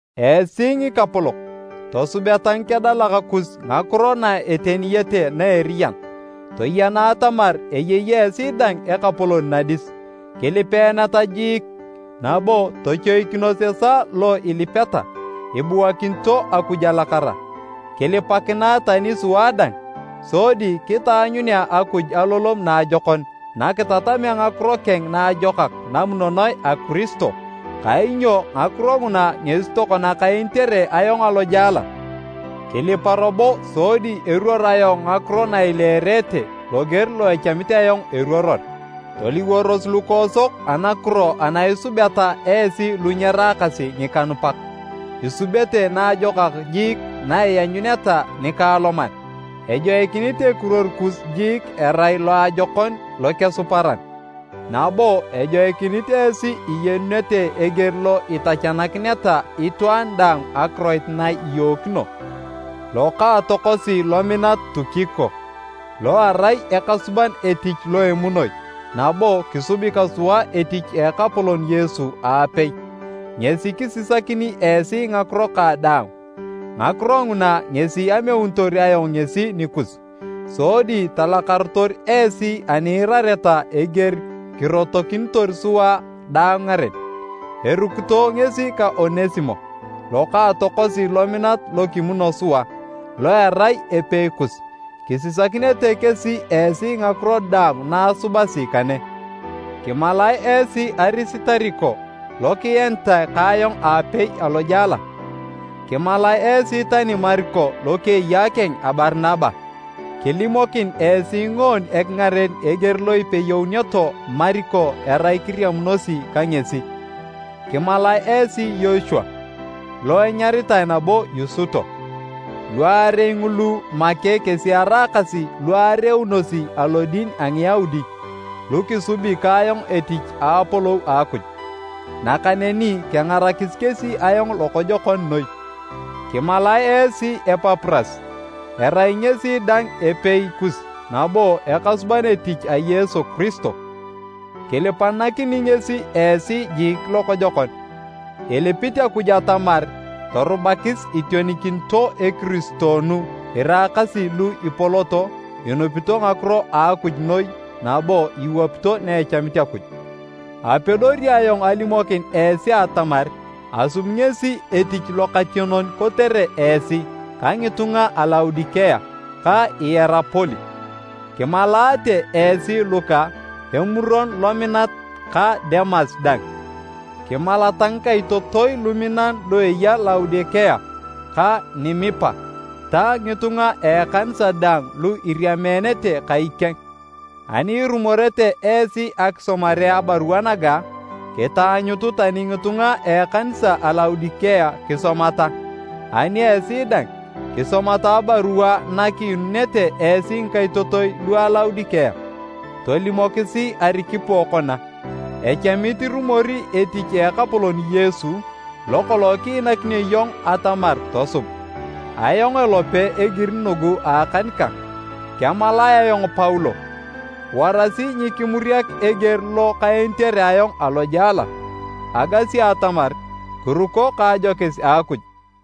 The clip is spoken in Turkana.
Esi ngikapolok, tosubeta ngikedalak kus ngakiro na eteniyete na eriyan. Toyena atamar eyei esi dang Ekapolon nadis. Kilipeeneta jiik, nabo tochoikinos esaa lo ilipeta, ibuakinito Akuj alakara. Kilipakinae tani sua dang, sodi kitaanyunea Akuj alolom naajokon nakitatamea ngakiro keng naajokak namunonoe a Kiristo, kainyo ngakiro nguna ngesi tokona kaenitere ayong alojela. Kilipa robo sodi eruor ayong ngakiro na ileerete loger lo echamit ayong eruoror. Toliworos lukoosok anakiro ana isubeta esi lu nyeraakasi ngikanupak, isubete naajokak jiik naianyuneta nikaaloman. Ejoikinit ekiruor kus jiik erai loajokon lokesuparan, nabo ejoikinit esi iyenunete eger lo itachakineta itwaan daang akiroit na iyookino. Lokaatokosi lominat Tukiko, lo erai ekasuban etich lo emunoi nabo kisubi ka sua etich a Ekapolon Yesu aapei, ngesi kisisakini esi ngakiro kang daang. Ngakiro nguna ngesi ameunitor ayong ngesi nikus sodi talakarotor esi ani iirareta eger kirotokinitor sua daang ngaren. Erukito ngesi ka Onesimo, lokaatokosi lominat lo kimuno sua, lo erai epeikus. Kisisakinete kesi esi ngakiro daang na asubasi kane. Kimalae esi Arisitariko lo kienitae ka ayong aapei alojela. Kimalae esi tani Mariko lokeyaakeng a Barinaba. (Kilimokin esi ngoon ekingaren eger lo ipeyouneto Mariko erai kiriamunosi ka ngesi). Kimalae esi Yochua lo enyaritae nabo Yusuto. Luarei ngulu make kesi eraakasi lu areunosi alodin a Ngiyaudi, lu kisubi ka ayong etich a Apolou a Akuj, nakaneni kengarakis kesi ayong lokojokon noi. Kimalae esi Epapuras, erai ngesi dang epeikus nabo ekasuban etich a Yesu Kiristo. Kilipanakini ngesi esi jiik lokojokon, ilipit Akuj atamar torubakis itionikinito ekiristoonu iraakasi lu ipoloto inupito ngakiro a Akuj noi nabo iwapito na echamit Akuj. Apedori ayong alimokin esi atamar asubi ngesi etich lokationon kotere esi ka ngitunga a Laodikea ka Ierapoli. Kimalaate esi Luka, emuron lominat ka Demas dang. Kimalata ngikaitotoi luminan lu eya Laodikea ka Nimipa ta ngitunga a ekanisa daang lu iriameenete kai keng. Ani irumorete esi akisomare abarua naga, kitaanyutu tani ngitunga a ekanisa a Laodikea kisomata. Ani esi dang, kisomata abarua na kiinunete esi ngikaitotoi lu a Laodikea. Tolimokisi Arikipo kona, “Echamit irumori etich a Ekapolon Yesu lokolong kiinakinio iyong atamar tosub.” Ayong elope egiri nugu a akan kang, kemalae ayong Paulo. Warasi nyikimuriak eger lo kaenitere ayong alojela! Agasi atamar kiruko ka ajokis a Akuj.